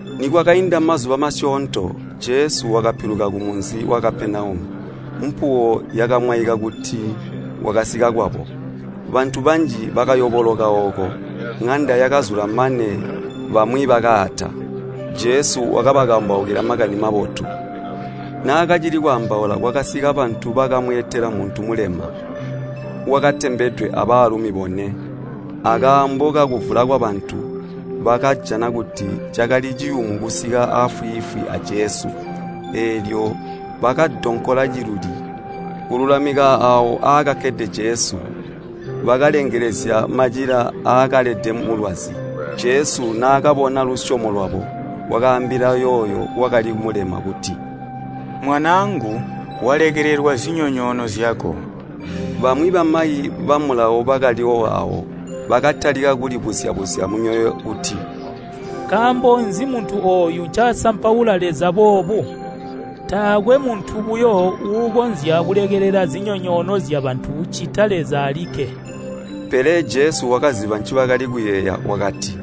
Nikwakainda mazuba masyoonto, Jesu wakapiluka kumunzi wa Kapenaumu, mpuwo yakamwaika kuti wakasika kwabo. Bantu banji bakayoboloka ooko, ŋanda yakazula mane bamwi bakaata. Jesu wakabakambaukila Makani Mabotu. Naakacili kwaambaula, kwakasika bantu bakamweetela muntu mulema, wakatembedwe abaalumi bone. Akaambo kakuvula kwabantu, bakajana kuti cakali ciyumu kusika aafwiifwi a Jesu. Eelyo bakadonkola ciluli kululamika aawo aakakkede Jesu. Bakalengelezya macila aakalede mulwazi. Jesu naakabona lusyomo lwabo, wakaambila yooyo wakali mulema kuti, “Mwanaangu, walekelelwa zinyonyoono zyako.” Bamwi bamayi ba Mulawo bakaliwo aawo, bakatalika kulibuzya-buzya mumyoyo kuti, “Nkaambo nzi muntu ooyu ncasampaula Leza boobu? Taakwe muntu buyo uukonzya kulekelela zinyoonyoono zyabantu ccita Leza alikke.” Pele Jesu wakaziba ncibakali kuyeeya wakati,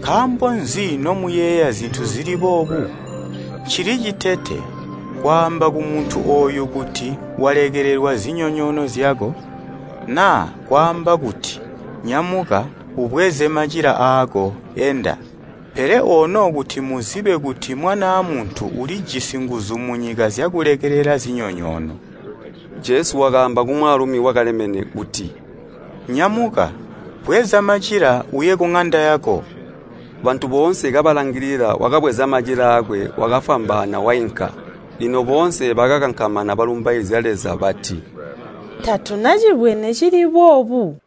“Nkaambo nzi nomuyeeya zintu zili boobu? Ncili citete, kwaamba kumuntu ooyu kuti ‘Walekelelwa zinyonyoono zyako,’ naa kwaamba kuti, ‘Nyamuka, ubweze macila aako enda?’ Pele ono kuti muzibe kuti Mwanaa Muntu ulijisi nguzu munyika zyakulekelela zinyonyoono.” Jesu wakati kumwaalumi wakalemene kuti, “Nyamuka, bweza macila uye kuŋanda yako!” Bantu boonse kabalangilila wakabweza macila aakwe wakafwambaana wainka. Lino boonse bakakankamana balumbaizya Leza bati, “Tatuna cibwene cili boobu.”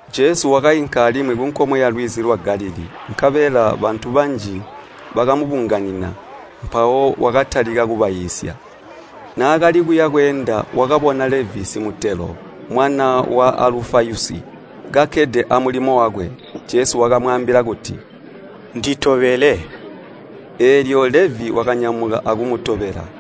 Jesu wakainka alimwi kunkomwe yalwizi lwa Galilii. Nkabela bantu banji bakamubunganina, mpawo wakatalika kubaiisya. Naakali kuya bweenda, wakabona Levi simutelo, mwana wa Alufayusi, kakkede amulimo wakwe. Jesu wakamwaambila kuti, “Nditobele.” Eelyo Levi wakanyamuka akumutobela.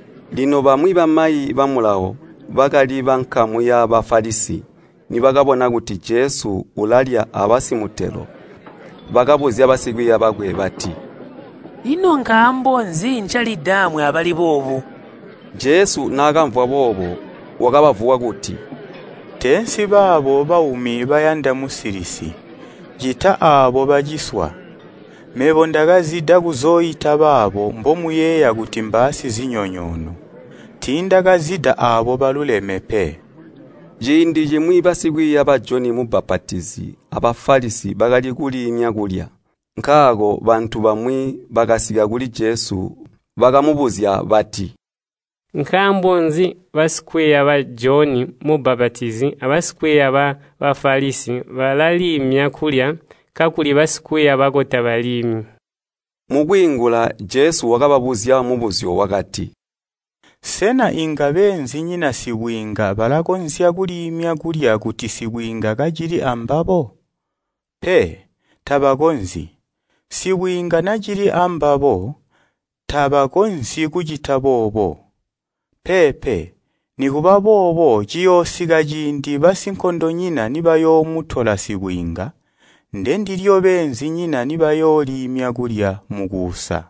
Lino bamwi bamayi ba Mulawo, bakali bankamu yaba Bafalisi, nibakabona kuti Jesu ulalya abantu aabo, bakabuzya basikwiiya bakwe bati, “Ino nkaambo nzi ncalidaamwi abali boobu?” Jesu naakamvwa boobo, wakabavuwa kuti, “Teensi baabo baumi bayanda musilisi, ccita aabo baciswa. Mebo ndakazida aabo mbomuyeeya kuti mbaasizinyonyoono, tiindakazida aabo balulami pe.” Ciindi cimwi basikwiiya ba Joni Mubbapatizi a Bafalisi bakali kuliimya kulya. Nkaako bantu bamwi bakasika kuli Jesu bakamubuzya bati, “Nkaambo nzi basikwiiya ba Joni Mubbapatizi aba Bafalisi balaliimya kulya kakuli basikwiiya bako tabaliimyi?” Mukwiingula Jesu wakababuzya mubuzyo wakati, “Sena inga beenzinyina sibwiinga balakonzya kuliimya kulya kuti sibwiinga kacili ambabo? Pe, tabakonzyi! Sibwiinga nacili ambabo tabakonzyi kucita boobo. Peepe, nikuba boobo ciyoosika ciindi basinkondonyina nibayoomutola sibwiinga, ndendilyo beenzinyina nibayooliimya kulya mukuusa.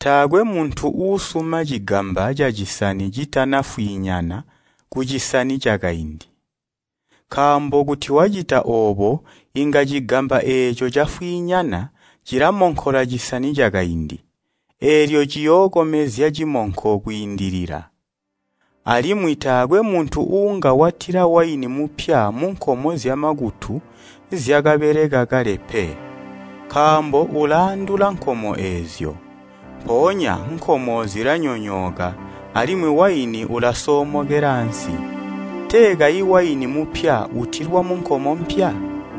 “Taakwe muntu uusuma cigamba cacisani citana fwinyana kucisani cakaindi, nkaambo kuti wacita oobo inga cigamba eeco cafwiinyana cilamonkola cisani cakaindi, eelyo ciyookomezya cimonko kwiindilila. Alimwi taakwe muntu uunga watila waini mupya munkomo zyamakutu zyakabeleka kale pe. Nkaambo ulaandula nkomo eezyo. Mpoonya nkomo zilanyoonyooka, alimwi waini ulasoomokela ansi. Tee kayi waini mupya utilwa munkomo mpya!”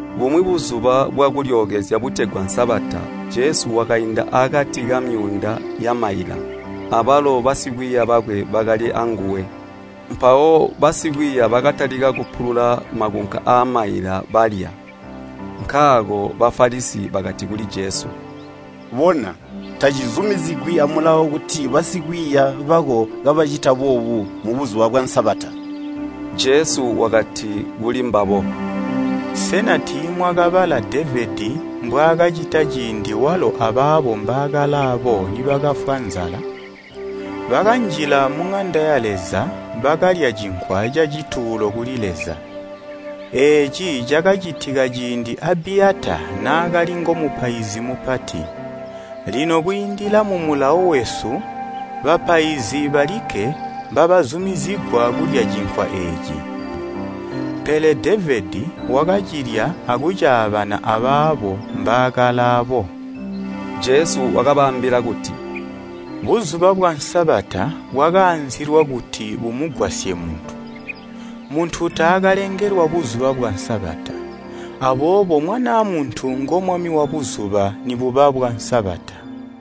Bumwi Buzuba bwa Kulyookezya butegwa Sabata Jesu wakainda akati kamyuunda yamaila, abalo basikwiiya bakwe bakali anguwe. Mpawo basikwiiya bakatalika kupulula makunka aamaila balya. Nkaako Bafalisi bakati kuli Jesu, “Bona, tacizumizigwi a Mulawo kuti basikwiiya bako kabacita boobu mu Buzuba bwa Sabata!” Jesu wakati kulimbabo, “Sena tiimwakabala Devedi mbwaakacita ciindi walo abaabo mbaakalaabo nibakafwa nzala? Bakanjila muŋanda ya Leza bakalya cinkwa cacituulo kuli Leza. Eeci cakacitika ciindi Abiyata naakali ngomupaizi mupati. Lino kwiindila mu Mulawo wesu bapaizi balikke mbabazumizigwa kulya cinkwa eeci, pele Devedi wakacilya akucaabana abaabo mbaakalaabo.” Jesu wakabaambila kuti, “Buzuba bwa Sabata bwakaanzilwa kuti bumugwasye muntu, muntu taakalengelwa Buzuba bwa Sabata. Aboobo Mwanaa Muntu ngo Mwami wa Buzuba nibuba bwa Sabata.”